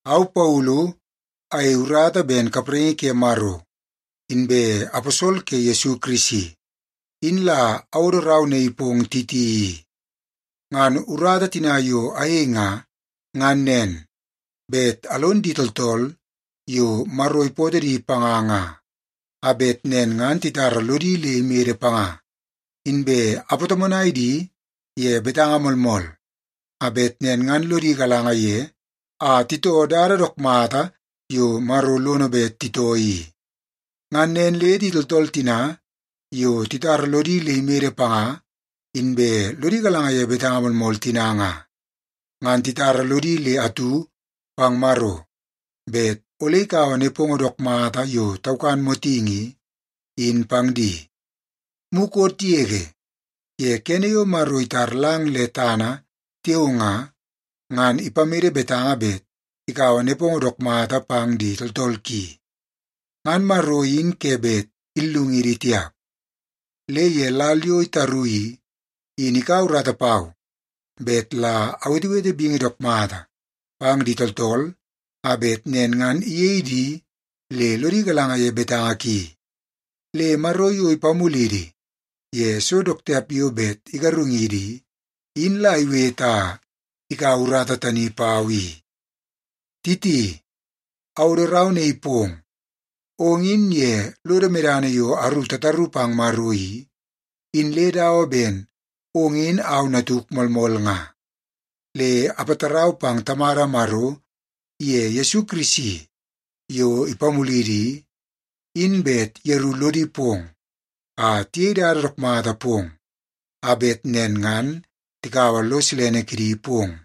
Au Paulu, ayei urata ben kapraingi ke Maro inbe aposol ke Yesu Kirisi, in la awodo rau naii pong Titi i. Ngan urata tina yo ayei nga, ngan nen; bet alon di tooltool yo Maro ipootoo di panga nga, a bet nen ngan titara lodi le imede panga, inbe apatomonai di ye betanga moolmool a bet nen ngan lodi galanga ye a titoo dada dook mata yo Maro lono bet titoo i. Ngan nen le di tooltool tina yo titara lodi le imede panga inbe lodi galanga ye betanga moolmool tina nga, ngan titara lodi le atu pang Maro bet ole ikaua nepongo dook mata yo taukan motingi i, in pang di. Mukot yege ye kene yo Maro itar lang le tana tiao nga, ngan ipamede betanga bet ikaua nepongo dook mata pang di tooltool ki. Ngan Maro in ke bet illungidi tiap. Le ye lal yo itaru i, in ikaua urata pau bet la awetewete bingi dook mata pang di tooltool a bet nen ngan iyei di le lodi galanga ye betanga ki. Le Maro yo ipamulidi ye so dook tiap yo bet igarungidi i, in la iwete a ikaua urata tani pau i. Titi, awodo rau naii pong. Ong in ye lodo medana yo aru tataru pang Maro i, in le dawa ben ong in au natuk moolmool nga. Le apatarau pang Tamada Maro iye Yesu Kirisi yo ipamulidi i, in bet yeru lodi pong a tiyei dada dook mata pong a bet nen ngan tikaua lo silene kidi pong.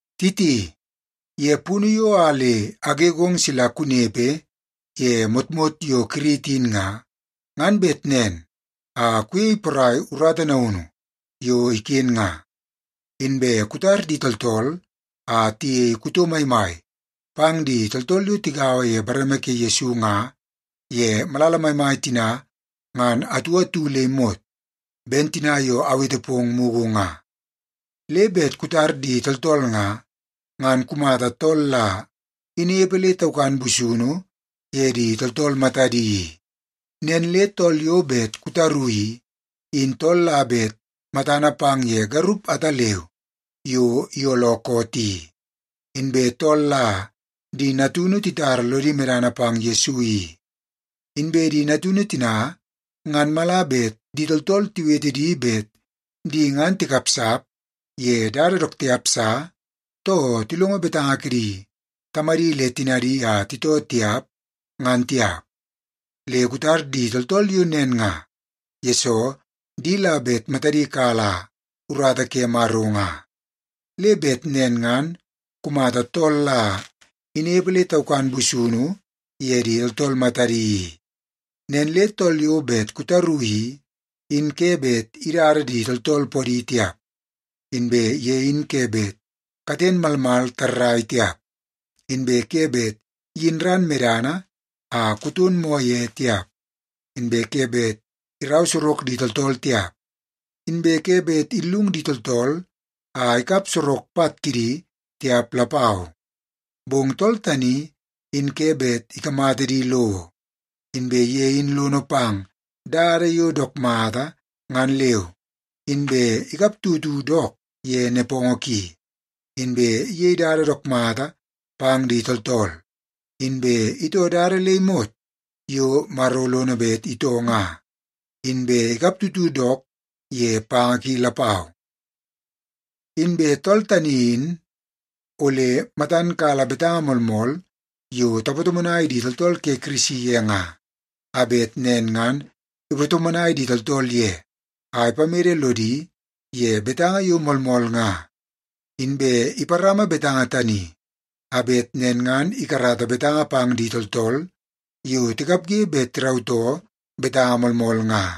Titi, ye punu yo a le agegong sila kunepe ye motmot yo Kirit in nga, ngan bet nen a kuyei porai urata naunu yo iken nga, inbe kutar di tooltool a tiyei kuto maimai pang di tooltool yo tigaua ye bareme ke Yesu nga ye malala maimai tina ngan atu atu le imot, ben tina yo awete pong mugu nga. Le bet kutar di tooltool nga, ngan kumata tool la inepe le taukan busunu ye di tooltool matadi i. Nen le tool yo bet kutaru i, in tool la bet matana pang ye garup ataleu yo iyooloo koot i, inbe tool la di natunu titara lodi medana pang Yesu i. Inbe di natunu tina ngan mala bet di tooltool tiwete di bet di ngan tikapsap ye dada dook tiap sa, too tilongo betanga kidi tamadi le tinadi a titoo tiap, ngan tiap. Le kutar di tooltool yo nen nga, yesoo di la bet matadi kala urata ke Maro nga. Le bet nen ngan kumata tool la inepe le taukan busunu ye di tooltool matadi i. Nen le tool yo bet kutaru i, in ke bet idada di tooltool podi tiap, inbe ye in ke bet katen malmal tarrai tiap, inbe ke bet iyin ran medana a kuton moo ye tiap, inbe ke bet irau sorok di tooltool tiap, inbe ke bet illung di tooltool a ikap sorok pat kidi tiap lapau. Bong tool tani in ke bet ikamata di lowo, inbe ye in lono pang dada yo dook mata ngan leu, inbe ikaptutu dook ye nepongo ki, inbe iyei dada dook mata pang di tooltool, inbe itoo dada le imot yo Maro lono bet itoo nga, inbe ikaptutu dook ye panga ki lapau. Inbe tool tani in ole matan kala betanga moolmool yo tapatomonai di tooltool ke Kirisi ye nga, a bet nen ngan ipatomonai di tooltool ye a ipamede lodi ye betanga yo moolmool nga. Inbe iparama betanga tani a bet nen ngan ikarata betanga pang di tooltool yo tikapge bet tirautoo betanga moolmool nga.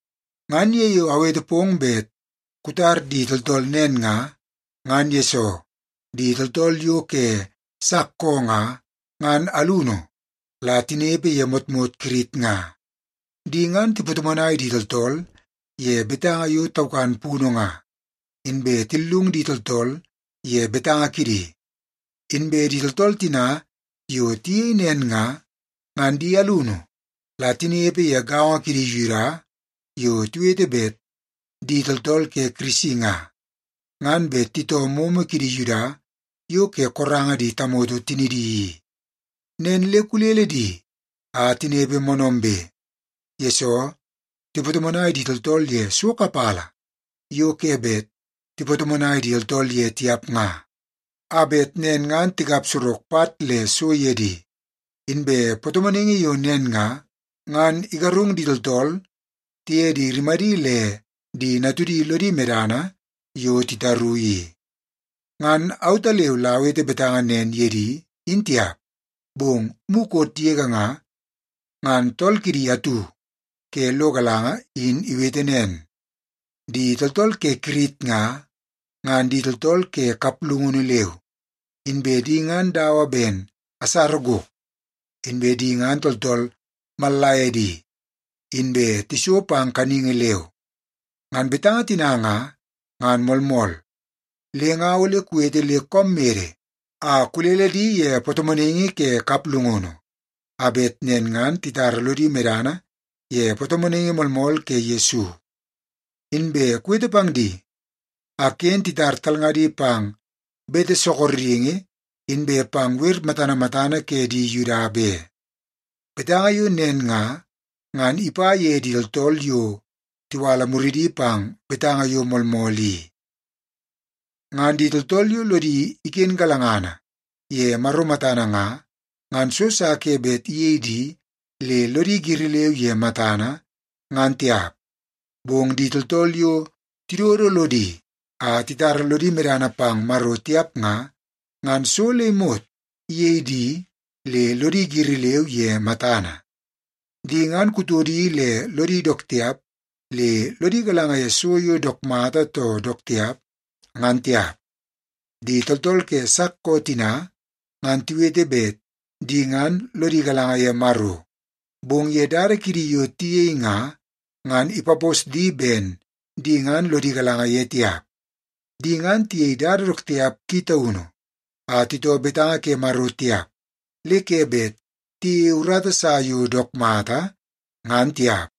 Ngan ye yo awete pong bet kutar di tooltool nen nga, ngan yesoo di tooltool yo ke sak koo nga, ngan alunu la tinepe ye motmot Kirit nga. Di ngan tipatomonai di tooltool ye betanga yo taukan punu nga, inbe tillung di tooltool ye betanga kidi. Inbe di tooltool tina yo tiyei nen nga, ngan di alunu la tinepe ye gaongo kidi Yuda yo tiwete bet di tooltool ke Kirisi nga, ngan bet titoo momo kidi Yuda yo ke koranga di tamoto tinidi i. Nen le kulele di a tinepe moonoombe, yesoo tipatomonai di tooltool ye so kapala yo ke bet tipatomonai di tooltool ye tiap nga a bet nen ngan tikap sorok pat le so ye di. Inbe patomonaingi yo nen nga, ngan igarung di tooltool tiye di rimadi le di natudi lodi medana yo titaru i. Ngan autaleu la awete betanga nen ye di in tiap, bong mukot yege nga, ngan tool kidi atu ke lo galanga in iwete nen, “Di tooltool ke Kirit nga, ngan di tooltool ke kaplungunu leu, inbe di ngan dawa ben asara gok, inbe di ngan tooltool mallaiedi, inbe tiso pang kaningi leu.” Ngan betanga tina nga, ngan moolmool. Le nga ole kuwete le koom mede a kulele di ye patomonaingi ke kaplungunu, a bet nen ngan titara lodi medana ye patomonaingi moolmool ke Yesu. Inbe kuwete pang di a ken titar talngadi pang bete sorokingi inbe pang wer matana matana ke di Yuda be. Betanga yo nen nga, ngan ipa ye di tooltool yo tiwala muridi pang betanga yo moolmool i. Ngan di tooltool yo lodi iken galangana ye Maro matana nga, ngan so sa ke bet iyei di le lodi giri leu ye matana, ngan tiap. Bong di tooltool yo tidodo lodi a titara lodi medana pang Maro tiap nga, ngan so le imot iyei di le lodi giri leu ye matana. Di ngan kutodi le lodi dook tiap le lodi galanga ye so yo dook mata too dook tiap, ngan tiap. Di tooltool ke sak koo tina, ngan tiwete bet di ngan lodi galanga ye Maro, bong ye dada kidi yo tiyei nga, ngan ipapos di ben di ngan lodi galanga ye tiap. Di ngan tiyei dada dook tiap ki taunu a titoo betanga ke Maro tiap le ke bet tiyeie urata sa yo dook mata, ngan tiap.